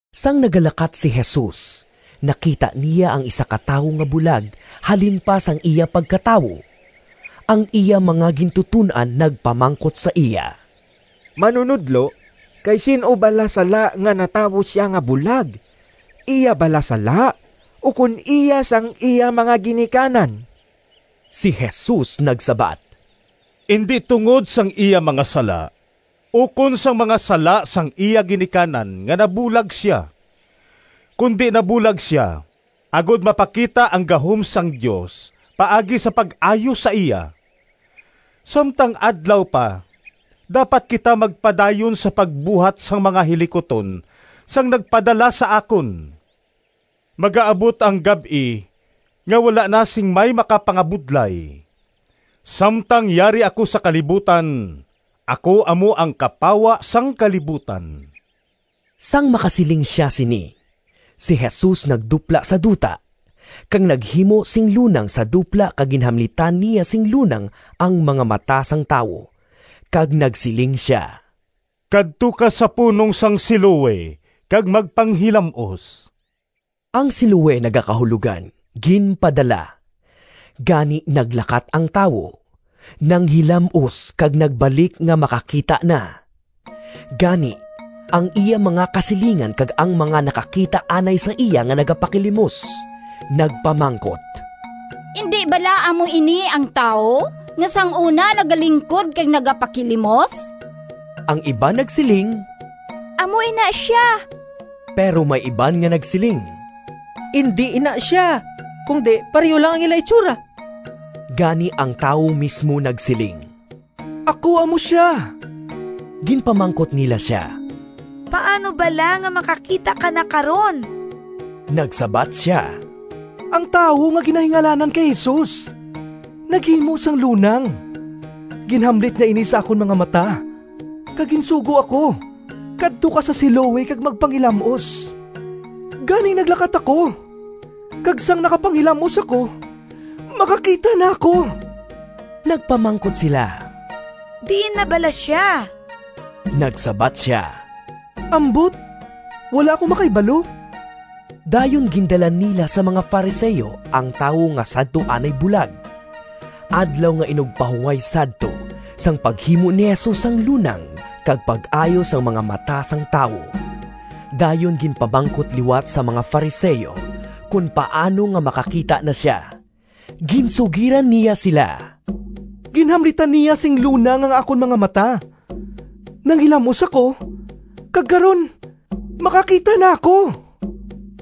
Sang nagalakat si Jesus, nakita niya ang isa ka tawo nga bulag halin pa sang iya pagkatawo. Ang iya mga gintuton-an nagpamangkot sa iya, “Manunodlo, kay sin-o bala sala nga natawo sia nga bulag? Iya bala sala, ukon iya sang iya mga ginikanan?” Si Jesus nagsabat, “Indi tungod sang iya mga sala ukon sang mga sala sang iya ginikanan nga nabulag sia, kundi nabulag sia agod mapakita ang gahom sang Dios paagi sa pag-ayo sa iya. Samtang adlaw pa dapat kita magpadayon sa pagbuhat sang mga hilikuton sang nagpadala sa akon. Magaabot ang gab-i nga wala na sing may makapangabudlay. Samtang yari ako sa kalibutan ako amo ang kapawa sang kalibutan.” Sang makasiling sia sini, si Jesus nagdupla sa duta kag naghimo sing lunang sa dupla kag ginhamlitan niya sing lunang ang mga mata sang tawo, kag nagsiling sia, “Kadto ka sa punong sang Siloe kag magpanghilam-os.” (Ang Siloe nagakahulogan “Ginpadala.”) Gani naglakat ang tawo, nanghilam-os kag nagbalik nga makakita na. Gani, ang iya mga kasilingan kag ang mga nakakita anay sa iya nga nagapakilimos, nagpamangkot, “Indi bala amo ini ang tawo nga sang una nagalingkod kag nagapakilimos?” Ang iban nagsiling, “Amo ina sia,” pero may iban nga nagsiling, “Indi ina sia, kundi pareho lang ang ila hitsura.” Gani ang tawo mismo nagsiling, “Ako amo sia.” Ginpamangkot nila sia, “Paano bala nga makakita ka na karon?” Nagsabat sia, “Ang tawo nga ginahingalanan kay Jesus naghimo sang lunang, ginhamlit niya ini sa akon mga mata, kag ginsugo ako, ‘Kadto ka sa Siloe kag magpanghilam-os.’ Gani naglakat ako, kag sang nakapanghilam-os ako, makakita na ako.” Nagpamangkot sila, “Diin na bala sia?” Nagsabat sia, “Ambot, wala ako makahibalo.” Dayon gindala nila sa mga Fariseo ang tawo nga sadto anay bulag. Adlaw nga Inugpahuway sadto sang paghimo ni Jesus sang lunang kag pag-ayo sang mga mata sang tawo. Dayon ginpamangkot liwat sang mga Fariseo kon paano nga makakita na sia. Ginsugiran niya sila, “Ginhamlitan niya sing lunang ang akon mga mata, nanghilam-os ako kag karon makakita na ako.”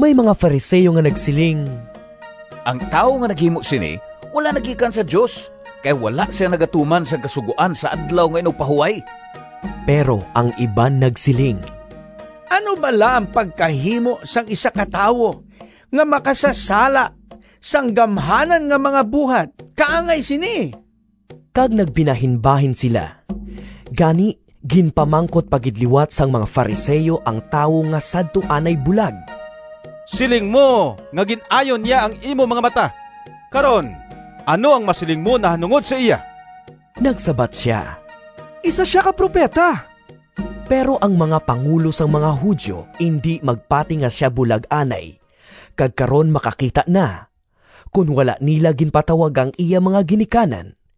May mga Fariseo nga nagsiling, “Ang tawo nga naghimo sini wala nagikan sa Dios, kay wala sia nagatuman sang kasugoan sa Adlaw nga Inugpahuway.” Pero ang iban nagsiling, “Ano bala ang pagkahimo sang isa ka tawo nga makasasala sang gamhanan nga mga buhat kaangay sini?” Kag nagbinahinbahin sila. Gani ginpamangkot pa gid liwat sang mga Fariseo ang tawo nga sadto anay bulag, “Siling mo nga gin-ayo niya ang imo mga mata, karon ano ang masiling mo nahanungod sa iya?” Nagsabat sia, “Isa sia ka propeta.” Pero ang mga pangulo sang mga Judio indi magpati nga sia bulag anay kag karon makakita na, kon wala nila ginpatawag ang iya mga ginikanan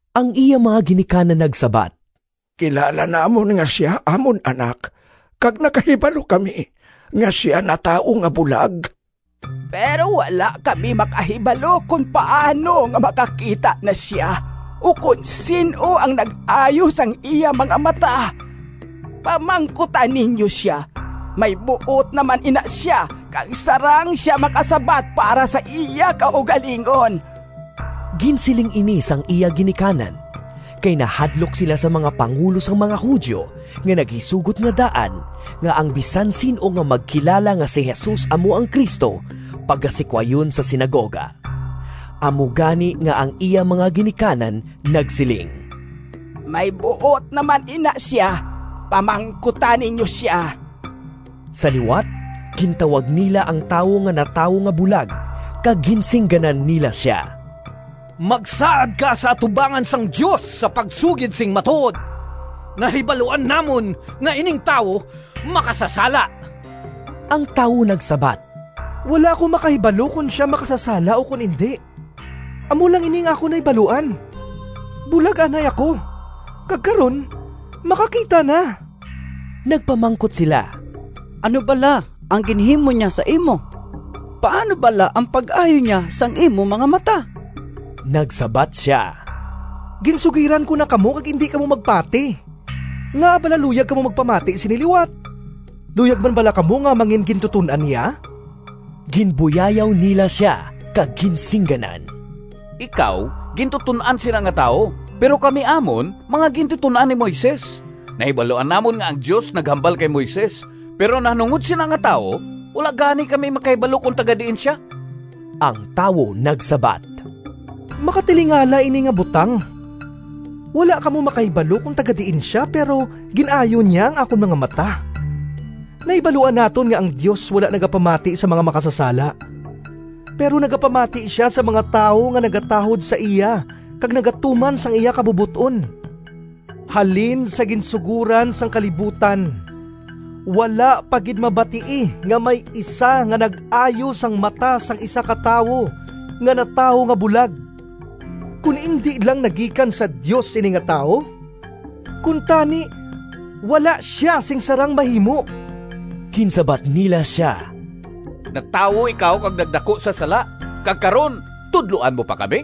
Ang iya mga ginikanan nagsabat, “Kilala namon nga sia amon anak kag nakahibalo kami nga sia natawo nga bulag, pero wala kami makahibalo kon paano nga makakita na sia, ukon sin-o ang nag-ayo sang iya mga mata. Pamangkuta ninyo sia, may buot naman ina sia, kag sarang sia makasabat para sa iya kaugalingon!” Ginsiling ini sang iya ginikanan, kay nahadlok sila sa mga pangulo sang mga Judio nga naghisugot nga daan nga ang bisan sin-o nga magkilala nga si Jesus amo ang Cristo pagasikwayon sa sinagoga. Amo gani nga ang iya mga ginikanan nagsiling, “May buot naman ina sia, pamangkuta ninyo sia!” Sa liwat gintawag nila ang tawo nga natawo nga bulag kag ginsingganan nila sia, “Magsaad ka sa atubangan sang Dios sa pagsugid sing matuod! Nahibaluan namon nga ining tawo makasasala.” Ang tawo nagsabat, “Wala ako makahibalo kon sia makasasala ukon indi. Amo lang ini ang akon nahibaluan: bulag anay ako, kag karon makakita na.” Nagpamangkot sila, “Ano bala ang ginhimo niya sa imo? Paano bala ang pag-ayo niya sang imo mga mata?” Nagsabat sia, “Ginsugiran ko na kamo, kag indi kamo magpati. Ngaa bala luyag kamo magpamati sini liwat? Luyag man bala kamo nga mangingintuton-an niya?” Ginbuyayaw nila sia kag ginsingganan, “Ikaw gintuton-an sina nga tawo, pero kami amon mga gintuton-an ni Moises. Nahibaluan namon nga ang Dios naghambal kay Moises, pero nahanungod sina nga tawo, wala gani kami makahibalo kon taga-diin sia!” Ang tawo nagsabat, “Makatilingala ini nga butang! Wala kamo makahibalo kon taga-diin sia, pero gin-ayo niya ang akon mga mata! Nahibaluan naton nga ang Dios wala nagapamati sa mga makasasala, pero nagapamati sia sa mga tawo nga nagatahod sa iya kag nagatuman sang iya kabubot-on. Halin sa ginsugoran sang kalibutan wala pa gid mabatii nga may isa nga nag-ayo sang mata sang isa ka tawo nga natawo nga bulag. Kon indi lang nagikan sa Dios ini nga tawo, kuntani wala sia sing sarang mahimo.” Ginsabat nila sia, “Natawo ikaw kag nagdaku sa sala, kag karon tudloan mo pa kami?”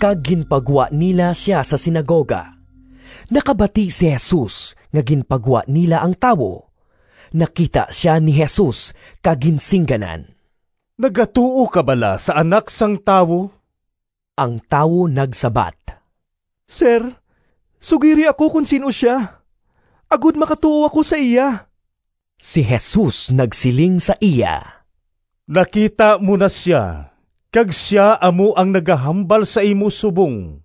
Kag ginpagwa nila sia sa sinagoga. Nakabati si Jesus nga ginpagwa nila ang tawo. Nakita sia ni Jesus kag ginsingganan, “Nagatuo ka bala sa Anak sang Tawo?” Ang tawo nagsabat, “Sir, sugiri ako kon sin-o sia agod makatuo ako sa iya!” Si Jesus nagsiling sa iya, “Nakita mo na sia, kag sia amo ang nagahambal sa imo subong.”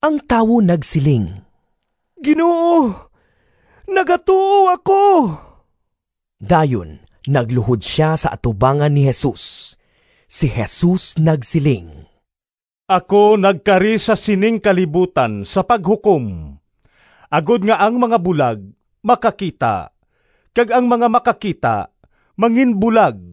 Ang tawo nagsiling, “Ginoo, nagatuo ako!” Dayon nagluhod sia sa atubangan ni Jesus. Si Jesus nagsiling, “Ako nagkari sa sining kalibutan sa paghukom, agod nga ang mga bulag makakita kag ang mga makakita manginbulag.”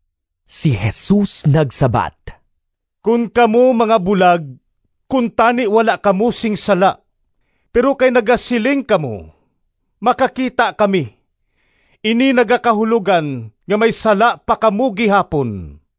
Si Jesus nagsabat, “Kon kamo mga bulag, kuntani wala kamo sing sala; pero kay nagasiling kamo, ‘Makakita kami,’ ini nagakahulogan nga may sala pa kamo gihapon.”